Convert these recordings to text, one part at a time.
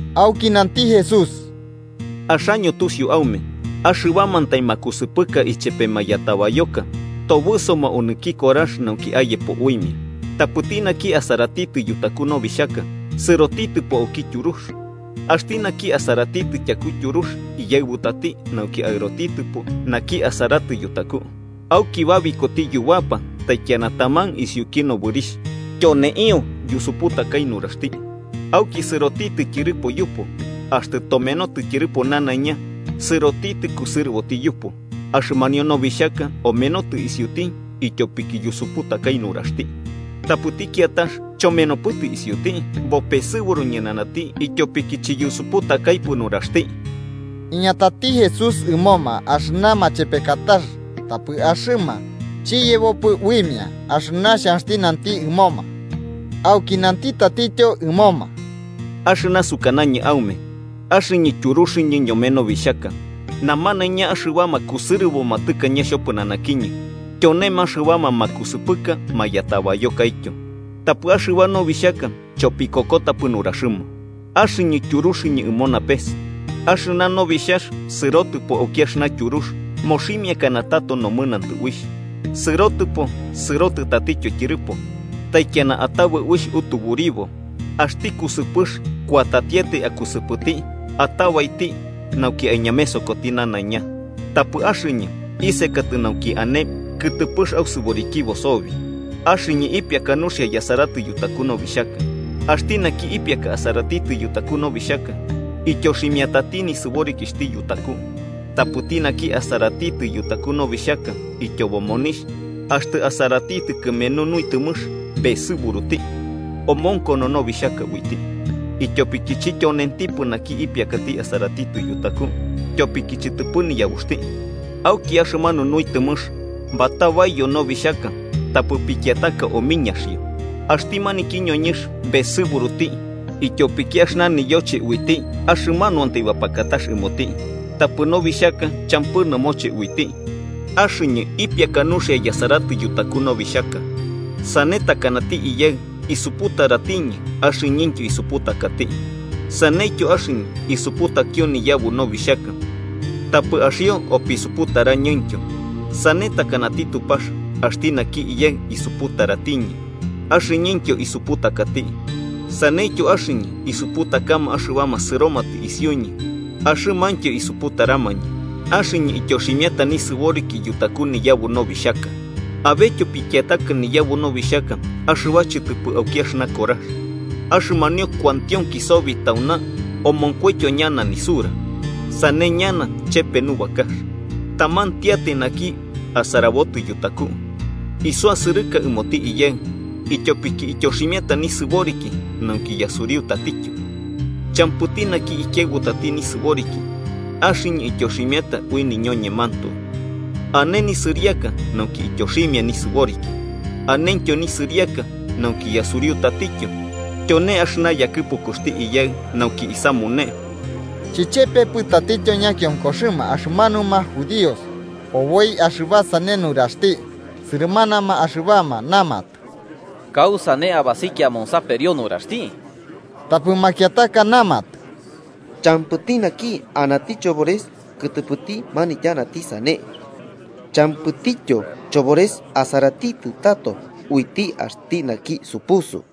Auki nanti Jesús: “Axaño tusiu aume axɨbamantai makusɨpɨka ichepe mayatabayoka tobɨsoma onɨki korax nauki ayepo uimia. Tapɨti naki asaratitɨ yutaku nobixhaka, sɨrotitɨpo auki tyurux. Axti naki asaratitɨ tyaku tyurux iyaɨbutati nauki aɨrotitɨpo naki asaratitɨ yutaku, auki babikoti yubapa taikiana taman isiuki nobɨrixh, tyoneio yusuputakai nuraxti. Auki sɨrotitɨ tyɨrɨpo yupu, axtɨ tomenotɨ tyɨrɨpo nanaiña, sɨrotitɨ kusɨrɨboti yupu. Axɨmanio nobixhaka omenotɨ isiuti ityopiki yusuputakai nuraxti. Tapɨti kiatax, chomenopɨtɨ isiuti, bopesɨburu ñɨnanati, ityopiki chiyusuputakaipɨ nuraxti. Iñatati Jesús ɨmoma axɨna machepekatax, tapɨ axɨma chiyebopɨ uimia axɨna xhanxti nanti ɨmoma. Auki nanti tatityo ɨmoma: “Axɨna sukanañɨ aume: Axɨñɨ tyuruxɨñɨ ñome nobixhaka. Namanaiña axɨbama kusɨrɨboma tɨkañe xhopɨnanakiñɨ, tyonema axɨbama makusɨpɨka mayatabayokaityo. Tapɨ axɨba nobixhaka chopikokotapɨ nuraxɨma. Axɨñɨ tyuruxɨñɨ ɨmo napes: axɨna nobixhax sɨrotɨpo auki axɨna tyurux, moximiakana tato nomɨnantɨ uixh. Sɨrotɨpo, sɨrotɨ tatityo tyɨrɨpo, taikiana atabɨ uixh utuburiboti. Axti kusɨpɨx kuatatiatai akusɨpɨti, atabaiti nauki aiñamesokoti nanaiña. Tapɨ axɨñɨ isekatɨ nauki ane kɨtɨpɨx ausɨborikibo sobi. Axɨñɨ ipiaka nuxia yasaratɨ yutaku nobixhaka. Axti naki ipiaka asaratitɨ yutaku nobixhaka ityoximiatati nisɨborikixhti yutaku. Tapɨti naki asaratitɨ yutaku nobixhaka ityobo monixh, axtɨ asaratitɨ kɨmenu nuitɨmɨx besɨburuti. Omonkono nobixhaka uiti, ityopiki chityonentipɨ naki ipiakati asaratitɨ yutaku tyopiki chɨtɨpɨ niyabuxti. Auki axɨmanu nuitɨmɨx batabaiyo nobixhaka tapɨ pikiataka omiñaxio. Axti maniki ñoñɨnx besɨburuti ityopiki axɨna iyoche uiti ta axɨmanuantai bapakatar ɨmoti, tapɨ nobixhaka champɨ nɨmoche uiti. Axɨñɨ ipiaka nuxia yasaratɨ yutaku nobixhaka. Sane takanati Iyaɨ isuputaratiñɨ axɨñɨntyo isuputakati, saneityo axɨñɨ isuputakio niyabu nobixhaka tapɨ axio opisuputarañɨntyo. “Sane takanati Tupax axti naki Iyaɨ isuputaratiñɨ, axɨñɨntyo isuputakati. Saneityo axɨñɨ isuputakama axɨbama sɨromatɨ isiuñɨ axɨmaintyo isuputaramañɨ. Axɨñɨ ityoximiata nisɨboriki yutaku niyabu nobixhaka. Abetyo pikiataka niyabu nobixhaka axɨba chɨtɨpɨ auki axɨna korax. Axɨmanio kuantionki sobi tauna omonkoityo ñana nisura, sane ñana chepe nubakax, tamantiatai naki asarabotɨ yutaku. Isuasɨrɨka ɨmoti Iyaɨ, ityopiki ityoximiata nisɨboriki nauki yasuriu tatityo. Champɨti naki ikiaɨbutati nisɨboriki, axɨñɨ ityoximiata ui niñoñemantoe. Ane nisɨriaka nauki ityoximia nisɨboriki, anentyo nisɨriaka nauki yasuriu tatityo, tyone axɨna yakɨpukuxti Iyaɨ nauki isamune. Chichepepɨ tatityo ñakionkoxɨma axɨmanuma judíos, oboi axɨba sane nuraxti. Sɨrɨmanama axɨbama namatɨ: –¿Kausane abasikia amonsaperio nuraxti? Tapɨ makiataka namatɨ: –Champɨti naki anati chobores kɨtɨpɨti manityanati sane. Champɨtityo chobores asaratitɨ tato uiti axti naki supusu.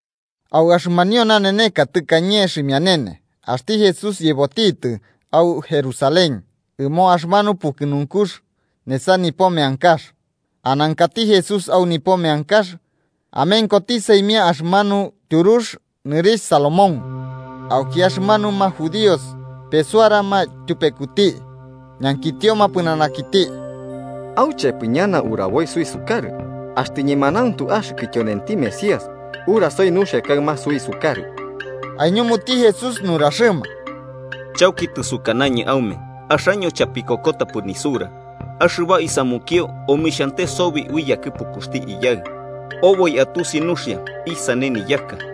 Au axɨmanio naneneka tɨkañe xhimianene, axti Jesús yebotitɨ au Jerusalén ɨmo axɨmanu pukɨnunkux nesa nipo meankax. Anankati Jesús au nipo meankax, amenkoti saimia axɨmanu tyurux nɨrixh Salomón. Auki axɨmanuma judíos pesuarama tyupekuti ñankitioma pɨnanakiti: –¿Auchepɨ ñana uraboi suisukarɨ? Axtɨ ñemanauntu axɨkɨ tyonenti Mesías, urasoi nuxia kaɨma suisukarɨ. Aiñumuti Jesús nuraxɨma: –Chauki tɨsukanañɨ aume, axaño chapikokotapɨ nisura. Axɨba isamukio omixhante sobi ui yakɨpukuxti Iyaɨ, oboi atusi nuxia isane niyaka.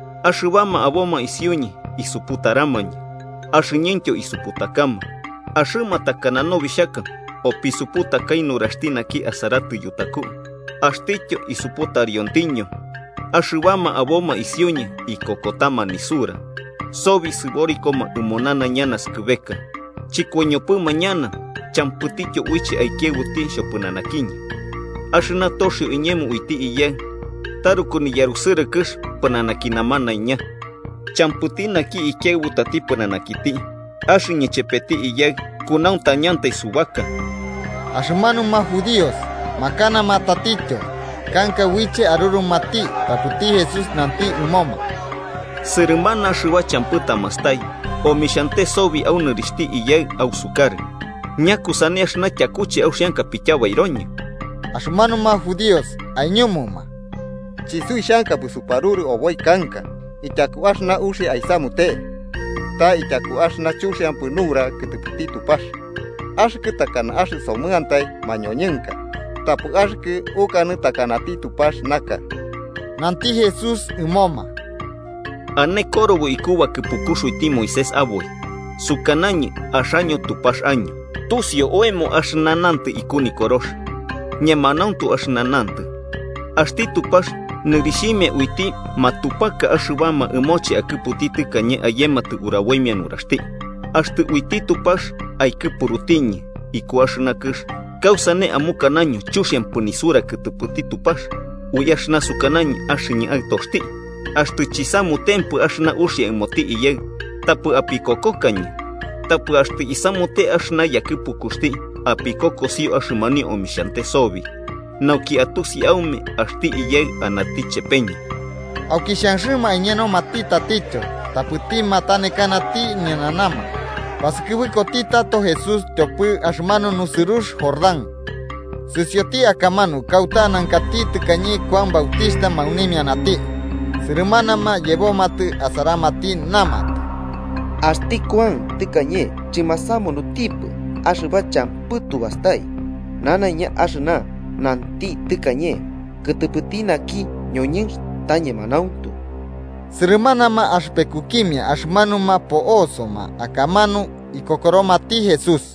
Axɨbama aboma isiuñɨ isuputaramañɨ, axɨñɨntyo isuputakama. Axɨma takana nobixhaka opisuputakai nuraxti naki asaratɨ yutaku, axtityo isuputariontiño. Axɨbama aboma isiuñɨ ikokotama nisura, sobi sɨborikoma ɨmo nanaiña naskɨbeka, chɨkoiñopɨma ñana champɨtityo uiche aikiaɨbuti xhopɨnanakiñɨ. Axɨna toxio iñemo uiti Iyaɨ taruku niyarusɨrɨkɨx pɨnanaki namanaiña, champɨti naki ikiaɨbutati pɨnanakiti. Axɨñɨ ichepeti Iyaɨ kunauntañantai subaka. Axɨmanuma judíos makanama tatityo kanka uiche arurumati. Tapɨti Jesús nanti ɨmoma: –Sɨrɨmana axɨba champɨ tamastai omixhiante sobi au nɨrixhti Iyaɨ ausukarɨ. ¿Ñakusane axɨna tyakuche auxianka apityabairoñɨ? Axɨmanuma judíos aiñumuma: –Chisuixhankapɨ suparurɨ oboi kanka ityaku axɨna uxia aisamute, ta ityaku axɨna chuxiampɨ nura kɨtɨpɨti Tupax. Axɨkɨ takana axɨsomɨantai mañoñɨnka, tapɨ axɨkɨ ukanɨ takanati Tupax naka. Nanti Jesús ɨmoma: –Ane Korobo iku bakɨpukux uiti Moisés aboi: ‘Sukanañɨ axaño Tupax año.’ Tusiu oemo axɨna nantɨ iku Nikorox, ñemanauntu axɨna nantɨ. Axti Tupax nɨrixhimia uiti axɨbama ɨmoche akɨputi tɨkañe ayematɨ uraboimia nuraxti. Axtɨ uiti Tupax aikɨpurutiñɨ iku axɨna kɨx, ¿kausane amukanaño chuxiampɨ nisura kɨtɨpɨti Tupax ui axɨna sukanañɨ axɨñɨ Aɨtoxti? Axtɨ chisamutempɨ axɨna uxia ɨmoti Iyaɨ, tapɨ apikokokañɨ. Tapɨ axtɨ isamute axɨna yakɨpukuxti, apikokosio axɨmanio omixhante sobi, nauki atusi aume axti Iyaɨ anati chepeñɨ. Auki xhanxɨma aiñenomati tatityo, tapɨti matanekanati ñɨnanama. Basɨkɨbɨkoti tato Jesús tyopɨ axɨmanu nusɨrux Jordán, sɨsioti akamanu kauta anankati tɨkañe Kuan Bautixhta maunimianati. Sɨrɨmanama yebomatɨ asaramati, namatɨ: –Axti Kuan tɨkañe chɨmasamunutipɨ axɨba champɨ tu bastai, nanaiña axɨna nanti tɨkañe kɨtɨpɨti naki ñoñɨnx ta ñemanauntu. Sɨrɨmanama axɨpekukimia axɨmanuma po'osoma akamanu ikokoromati Jesús.